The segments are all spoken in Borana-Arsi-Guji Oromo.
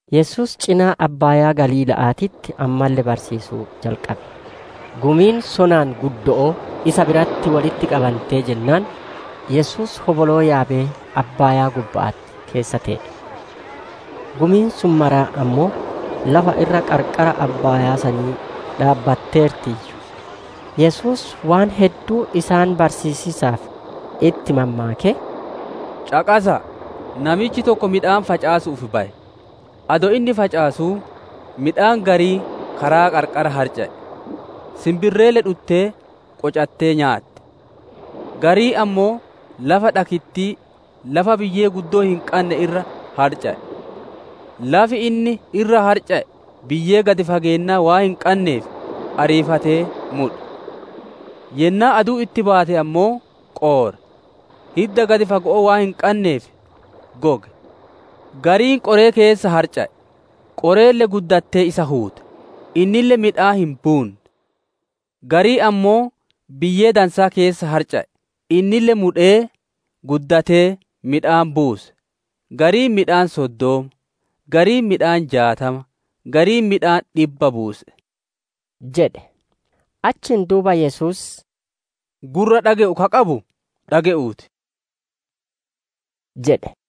Yesuus cinaa abbaayaa Galiila'aatitti ammalle barsiisuu jalqabe. Gumiin sonaan guddo'oo isa biratti wolitti qabantee jennaan, Yesuus hoboloo yaabee Abbaayaa gubba'atti keessa tee'e. Gumiin sun maraa ammoo lafa irra qarqara abbaayaa sanii dhaabbatteertiiyyu. Yesuus waan hedduu isaan barsiisiisaaf itti mammaakee: «Caqasa'a! Namichi tokko midhaan facaasu'uuf baye. Adoo inni facaasuu, midhaan gariin karaa qarqara harca'e; sinbirreelle dhuttee qocattee nyaatte. Gariin ammoo lafa dhakittii, lafa biyyee guddoo hin qanne irra harca'e; lafi inni irra harca'e biyyee gad fageenna waan hin qanneef ariifatee mudhe. Yennaa aduun itti baate ammoo qoore; hidda gad fago'oo waan hin qanneef goge. Gariin qoree keessa harca'e; qoreelle guddattee isa huute; innille midhaan hin buune. Gariin ammoo biyyee dansaa keessa harca'e; innille mudhee, guddatee, midhaan buuse: gariin midhaan soddoma, gariin midhaan jaatama, gariin midhaan dhibba buuse!» jedhe. Achiin duuba Yesuus, «Gurra dhage'u ka qabu dhage'uu ti» jedhe.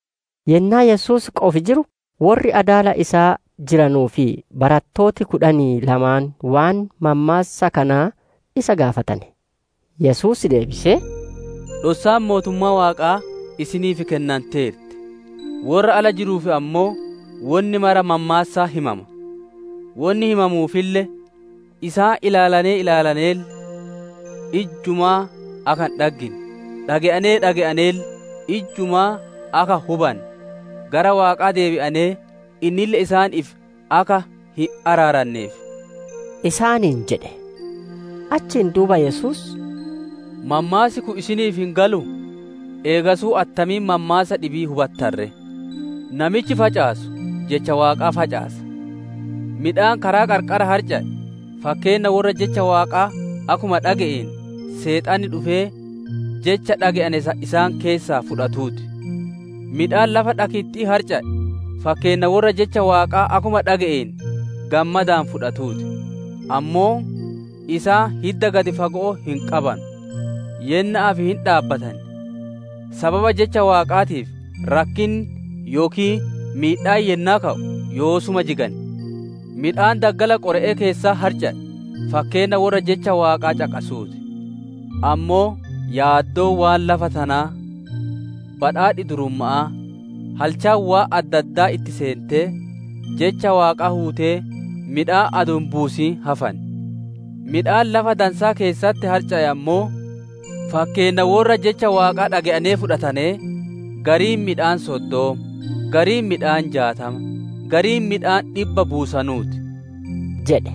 Yennaa Yesuus qofi jiru, worri adaala isaa jiranu fi barattooti kudhanii lamaan waan mammaassa kanaa isa gaafatane. Yesuus deebisee, «Dhossaan mootummaa Waaqaa isiniif kennanteerti; worra ala jiruuf ammoo wonni maraa mammaassaan himama. Wonni himamuufille, «‹Isaan ilaalanee ilaalaneelle, ijjumaa akka hin dhaggine; dhage'anee dhage'aneelle, ijjumaa akka hin hubanne; gara Waaqaa deebi'anee innille isaaniif akka hin araaranneefii›» isaaniin jedhe. Achiin duuba Yesuus isaaniin, «Mammaassi kun isiniif hin galuu? Eegasuu attamiin mammaassa dhibii hubattan ree? Namichi facaasu jecha Waaqaa facaasa. Midhaan karaa qarqara harca'e, fakkeenna worra jecha Waaqaa akkuma dhage'aneen, Seexanni dhufee jecha dhage'ane san isaan keessaa fudhatuu ti. Midhaan lafa dhakiti'itti harca'e, fakkeenna worra jecha Waaqaa akkuma dhage'aneen gammadaan fudhatanuu ti. «Ammoo isaan hidda gad fago'oo hin qabanu; yenna'aaf hin dhaabbatan; sababa jecha Waaqaatiif rakkinni yookiin miidhaan yennaa ka'u yoosuma jigan. Midhaan daggala qore'ee keessatti harca'e, fakkeenna worra jecha Waaqaa caqasuu ti. Ammoo yaaddoon waan lafa tanaa, badhaadhi durumma'aa, halchaan waan adda addaa itti seentee, jecha Waaqaa huutee midhaan adoo hin buusin hafan. Midhaan lafa dansaa keessatti harca'e ammoo, fakkeenna worra jecha Waaqaa dhage'ane fudhatanee, gariin midhaan soddoma, gariin midhaan jaatama, gariin midhaan dhibba buusanuu ti» jedhe.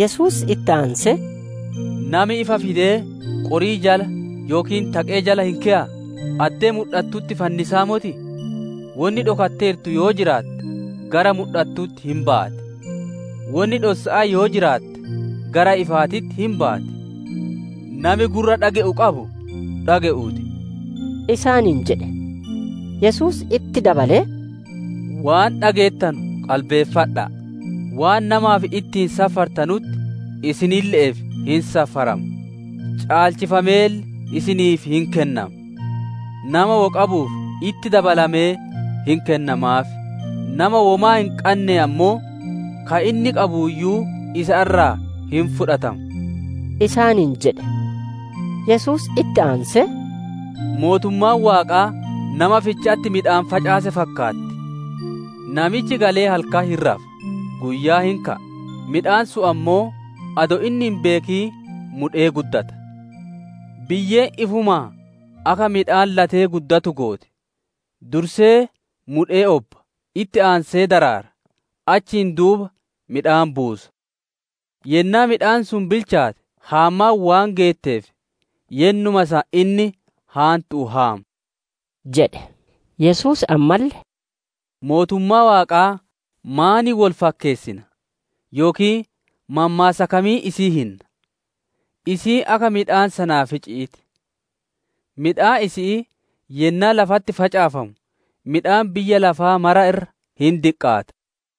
Yesuus itti aansee, «Nami ifa fidee qorii jala yookiin taqee jala hin keyaa? Addee mudhatutti fannisaa motii? Wonni dhokatteertu yoo jiraatte, gara mudhattutti hin baati; wonni dhossa'aa yoo jiraatte, gara ifaatitti hin baati. Nami gurra dhage'u qabu dhage'uu ti» isaaniin jedhe. Yesuus itti dabalee, «Waan dhageettanu qalbeeffadha'a! Waan namaaf ittiin safartanutti isinille'eef hin safarama; caalchifameelle isiniif hin kennama. Nama wo qabuuf, itti dabalamee hin kennamaaf; nama womaa hin qanne ammoo, ka inni qabuuyyuu isa irraa hin fudhatama» isaaniin jedhe. Yesuus itti aansee, «Mootummaan Waaqaa nama ficha'atti midhaan facaasee fakkaatti. Namichi galee halkan hin rafa, guyyaa hin ka'a; midhaan sun ammoo adoo inni hin beekin mudhee guddata. Biyyeen ifumaan akka midhaan latee guddatu gooti; dursee mudhee obba, itti aansee daraara, achiin duuba midhaan buusa. Yennaa midhaan sun bilchaate, haammaan waan geetteef, yennuma san inni haantu'uun haama» jedhe. Yesuus ammalle, «Mootummaa Waaqaa maaniin wol fakkeessina? Yookiin mammaassa kamiin isii hinna? Isiin akka midhaan Sanaafici'ii ti. Midhaan isi'ii yennaa lafatti facaafamu midhaan biyya lafaa maraa irra hin diqqaata.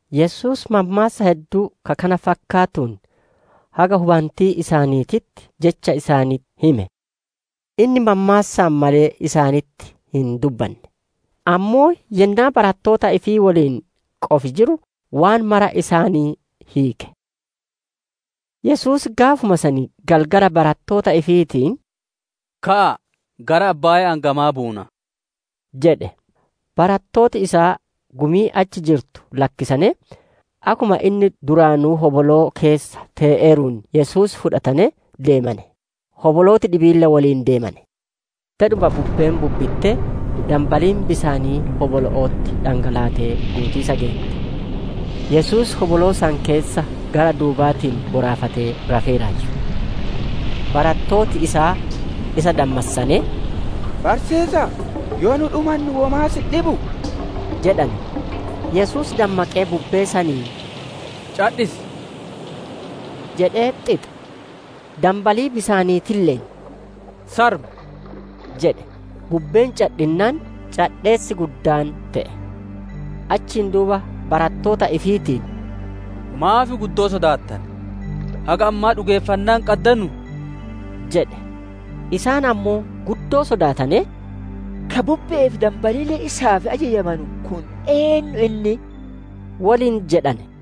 Yesuus mammaassa hedduu ka kana fakkaatuun haga hubantii isaaniititti jecha isaanitti hime. Inni mammaassaan malee isaanitti hin dubbanne; ammoo yennaa barattoota ifii woliin qofi jiru, waan maraa isaanii hiike. Yesuus gaafuma san galgala barattoota ifiitiin, «Ka'aa, gara abbaaya'aan gamaa buunaa» jedhe. Barattooti isaa gumii achi jirtu lakkisanee, akkuma inni duraanuu hoboloo keessa tee'eeruun Yesuus fuudhanee deemane; hobolooti dhibiille woliin deemane. Dedhuma bubbeen bubbittee, danbaliin bisaanii hobolo'otti dhangalaatee guutiisa geette. Yesuus hoboloo san keessa gara duubaatiin boraafatee rafeeraayyu. Barattooti isaa isa dammassanee, «Barsiisa'a! Yoo nu dhumannu womaa si hin dhibuu!» jedhane. Yesuus dammaqee bubbee saniin, «Cadhisi!» jedhee xixe. Danbalii bisaaniitille'een, «Sarmi!» jedhe. Bubbeen cadhinnaan, cadheessi guddaan te'e. Achiin duuba barattoota ifiitiin, «Maaf guddoo sodaattane? Haga ammaa dhugeeffannaa hin qaddanuu?» jedhe. Isaan ammoo guddoo sodaatanee, «Ka bubbe'ee fi danbaliille isaaf ajajamanu kun eennu inni?» woliin jedhane.